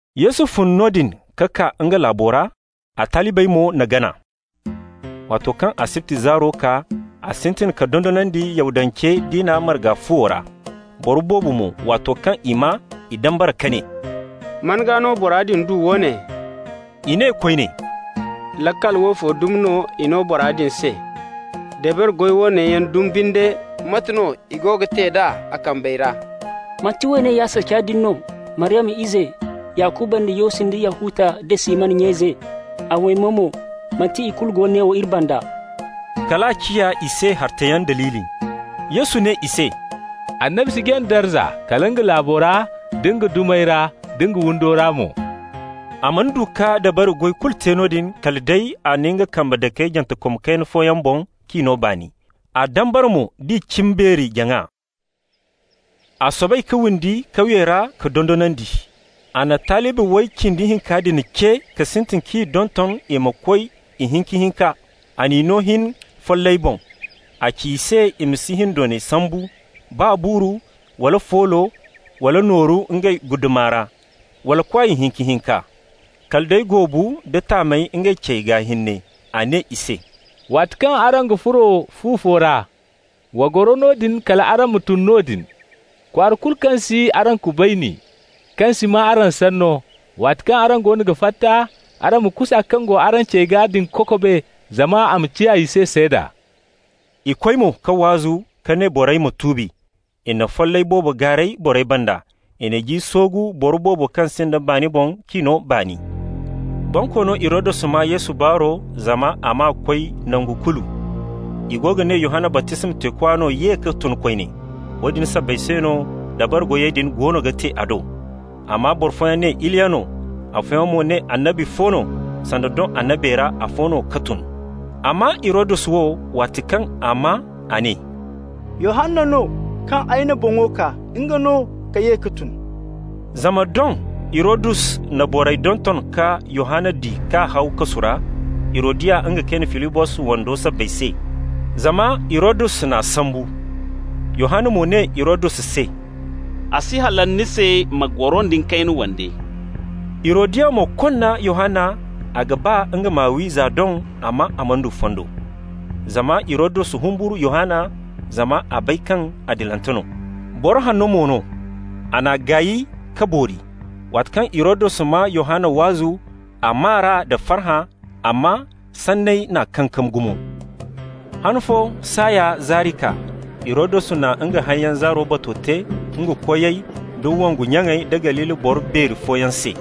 Yesu fun noodin ka kaa nga laabo ra, a talibey mo n'a gana. Waato kaŋ asibti zaaro kaa, a sintin ka dondonandi Yahudance diina marga fuwo ra. Boro boobo mo, waato kaŋ i maa, i dambara ka ne: «Man gaa no bora din du woone?» I ne koyne: «Laakal woofo dumi no i no bora din se. Dabari goy woone yaŋ dumi binde, mate no i go ga te d'a a kambey ra? Manti woone ya saca din no, Maryama ize, Yakuba nda Yosi nda Yahuta nda Siman nya ize? A waymey mo, manti ikulu go neewo iri banda?» Kal a ciya i se hartayaŋ daliili. Yesu ne i se: «Annabi si jaŋ darza, kala nga laabo ra, da nga dumey ra, da nga windo ra mo.» A mana du ka dabari goy kulu te noodin kala day a na nga kambe dake jantekom kayna fooyaŋ boŋ k'i no baani. A dambara mo d'i cimbeeri-jaŋa. A soobay ka windi kawyey ra ka dondonandi. A na talibi way cindi hinka din ce ka sintin k'i donton i ma koy ihinka-hinka. A n'i no hin follayey boŋ. A ci i se i ma si hindoonay sambu, baa buuru, wala foolo, wala nooru ngey guddama ra, wala kwaay hinka-hinka. Kala day goobu, da taamey ngey cey gaa hinne. A ne i se: «Waato kaŋ araŋ ga furo fu fo ra, wa goro noodin kal araŋ ma tun noodin. Kwaara kulu kaŋ si araŋ kubayni, kaŋ si maa araŋ sanno, waati kaŋ araŋ goono ga fatta, araŋ ma kusa kaŋ go araŋ ce gaa din kokobe, zama a ma ciya i se seeda.» I koy mo ka waazu ka ne borey ma tuubi. I na follay boobo gaaray borey banda. I na ji soogu boro boobo kaŋ sinda baani boŋ k'i no baani. Bonkoono Hirodus maa Yesu baaro, zama a maa koy nangu kulu. I go ga ne Yohanna baptisma teekwa no ye ka tun koyne. Woodin sabbay se no dabari goyey din goono ga te a do. Amma boro fooyaŋ ne Iliya no, afooyaŋ mo ne annabi fo no, sanda doŋ annabey ra afo no ka tun. Amma Hirodus wo, waati kaŋ a maa, a ne: «Yohanna no, kaŋ ay n'a boŋo kaa, nga no ka ye ka tun.» Zama doŋ Hirodus na borey donton ka Yohanna di k'a haw kasu ra Hirodiya nga kayne Filibos wando sabbay se, zama Hirodus n'a sambu. Yohanna mo ne Hirodus se: «A si halal ni se ni ma goro nda ni kayne wande.» Hirodiya mo konna Yohanna, a ga ba nga m'a wi za doŋ, amma a mana du fondo. Zama Hirodus humburu Yohanna, zama a bay kaŋ adilante no, boro hanno mo no. A n'a gaay ka boori. Waati kaŋ Hirodus maa Yohanna waazu, a maa r'a nda farhã, amma sanney n'a kankam gumo. Han fo saaya zaari kaa. Hirodus na nga hayyaŋ zaaro bato te nga koyey da wongu nyaŋey da Galili boro beeri fooyaŋ se.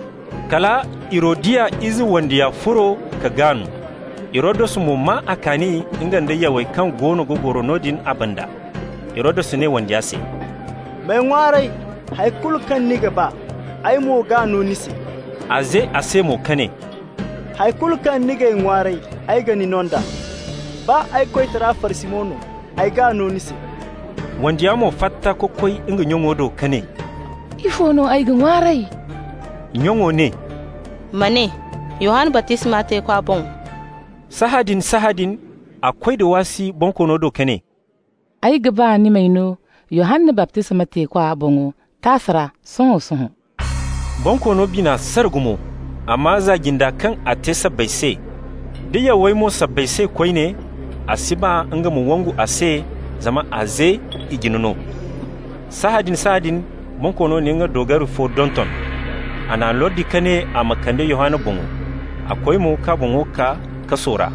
Kala Hirodiya ize wandiya furo ka gaan. Hirodus mo maa a kaani, nga nda yawey kaŋ goono ga goro noodin a banda. Hirodus ne wandiya se: «M'ay ŋwaaray hari kulu kaŋ ni ga ba, ay mo g'a no ni se.» A ze a se mo ka ne: «Hay kulu kaŋ ni g'ay ŋwaaray, ay ga ni no nd'a. Baa ay koytara farsimo no, ay g'a no ni se.» Wandiya mo fatta ka koy nga nyaŋo do ka ne: «Ifo no ay ga ŋwaaray?» Nyaŋo ne: «Ma ne Yohanna baptisma teekwa boŋo.» Sahãadin-sahãadin a koy da waasi bonkoono do ka ne: «Ay ga ba ni m'ay no Yohanna baptisma teekwa boŋo taasa ra, sohõ-sohõ.» Bonkoono bina sara gumo, amma za-jinda kaŋ a te sabbay se, da yawey mo sabbay se koyne, a si ba nga ma wangu a se, zama a ze i jine no. Sahãadin-sahãadin bonkoono na nga doogari fo donton. A n'a lordi ka ne a ma kande Yohanna boŋo. A koy mo k'a boŋo kaa kaso ra,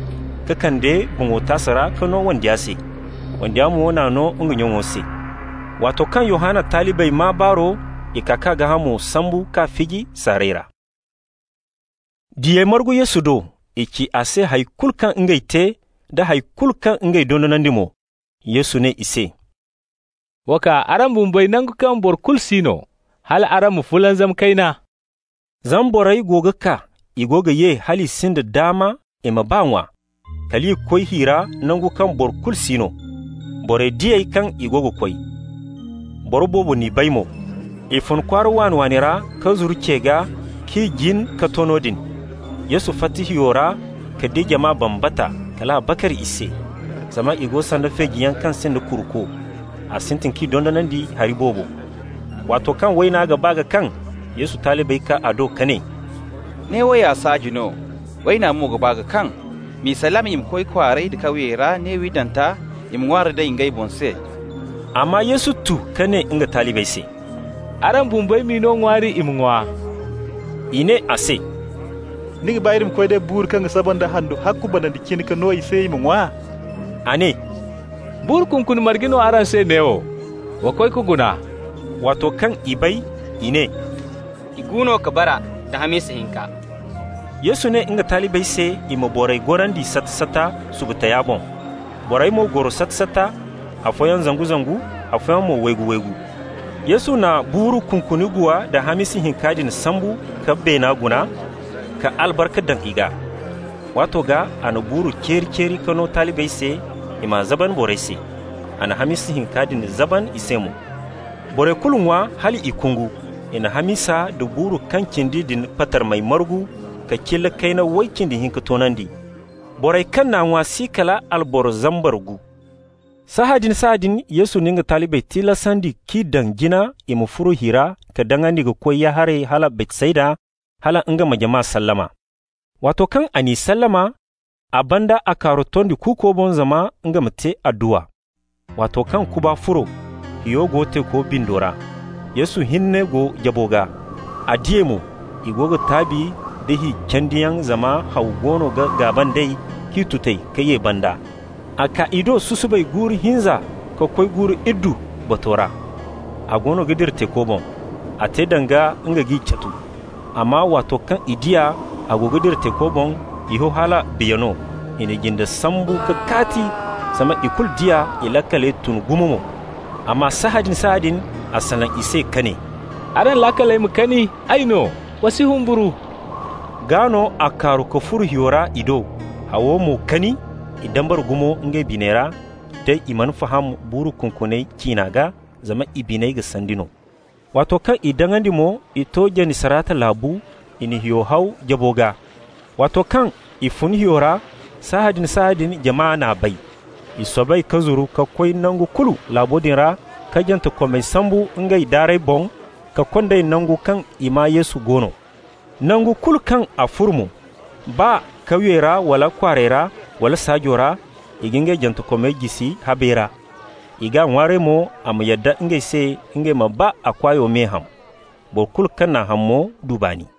ka kande boŋo taasa ra k'a no wandiya se. Wandiya mo n'a no nga nyaŋo se. Waato kaŋ Yohanna talibey maa baaro, i kaa k'a gaahamo sambu k'a fiji saaray ra. Diyey margu Yesu do. I ci a se hay kulu kaŋ ngey te, da hay kulu kaŋ ngey dondonandi mo. Yesu ne i se: «Wa kaa araŋ bumbey nangu kaŋ boro kulu si no, hal araŋ ma fulanzam kayna.» Zama borey go ga kaa, i go ga ye hal i sinda daama i ma baa ŋwa. Kal i koy hi ra nangu kaŋ boro kulu si no. Borey di ey kaŋ i go ga koy. Boro boobo n'i bay mo. I fun kwaara waani-waani ra ka zuru ce gaa k'i jin ka to noodin. Yesu fatta hiyo ra ka di jama bambata, kal a bakar i se. Zama i go sanda feejiyaŋ kaŋ sinda kuruko. A sintin k'i dondonandi hari boobo. Waato kaŋ wayna ga ba ka kaŋ, Yesu talibey kaa a do ka ne: «Neewo ya saaji no, wayna mo ga ba ka kaŋ. M'i sallama i ma koy kwaarey da kawyey ra ne windanta, i ma ŋwaari day ngey boŋ se.» Amma Yesu tu ka ne nga talibey se: «Araŋ bumbey m'i no ŋwaari i ma ŋwa.» I ne a se: «Ni ga ba iri ma koy ka day buuru kaŋ ga saba nda handu ahakku banandi cine ka no i se i ma ŋwa?» A ne: «Buuru kunkuni marge no araŋ se neewo? Wa koy ka guna.» Waato kaŋ i bay, i ne: «Igu no ka bara, da hamisa hinka.» Yesu ne nga talibey se i ma borey gorandi sata-sata subu taya boŋ. Borey mo goro sata-sata, afooyaŋ zangu-zangu, afooyaŋ mo waygu-waygu. Yesu na buuru kunkuni guwa da hamisa hinka din sambu ka beena guna ka albarka daŋ i gaa. Waato gaa a na buuru ceeri-ceeri ka no talibey se, i m'a zaban borey se. A na hamisa hinka din zaban i se mo. Borey kulu ŋwa hal i kungu. I na hamisa nda buuru kaŋ cindi din patarmey margu, ka cilla kayna way cindi hinka toonandi. Borey kaŋ n'a ŋwa si kala alboro zambar gu. Sahãadin-sahãadin Yesu na nga talibey tilasandi k'i daŋ jina i ma furo hi ra ka daŋandi ka koy ya-haray hala Baytsayda, hala nga ma jama sallama. Waato kaŋ a n'i sallama, a banda a kaaru tondi kuuko boŋ zama nga ma te adduwa. Waato kaŋ kuba furo, hiyo go teeko bindo ra. Yesu hinne go jabo gaa. A di ey mo, i go ga taabi da hi candiyaŋ, zama haw goono ga gaaba nd'ey k'i tuti ka ye banda. A kaa i do susubay guuru hinza ka koy guuru iddu bato ra, a goono ga dira teeko boŋ. A te danga nga g'i casu. Amma waato kaŋ i di a, a go ga dira teeko boŋ, i ho hala biya no. I na jinde sambu ka kaati. Zama i kulu di a, i laakaley tun gumo mo. Amma sahãadin-sahãadin a salaŋ i se ka ne: «Araŋ laakaley ma kani, ay no! Wa si humburu.» Gaa no a kaaru ka furo hiyo ra i do. Hawo mo kani. I dambara gumo ngey biney ra. Day i mana faham buuru kunkuney ciina gaa, zama i biney ga sandi no. Waato kaŋ i daŋandi mo, i to Janisarata laabu, i na hiyo haw jabo gaa. Waato kaŋ i fun hiyo ra, sahãadin-sahãadin jama n'a bay. I soobay ka zuru ka koy nangu kulu laabo din ra ka jantekomey sambu ngey daarey boŋ ka kond'ey nangu kaŋ i maa Yesu go no. Nangu kulu kaŋ a furo mo, baa kawyey ra wala kwaarey ra, wala saajo ra, i ga ngey jantekomey jisi habey ra. I g'a ŋwaaray mo a ma yadda ngey se ngey ma baa a kwaayo me ham. Boro kulu kaŋ n'a ham mo du baani.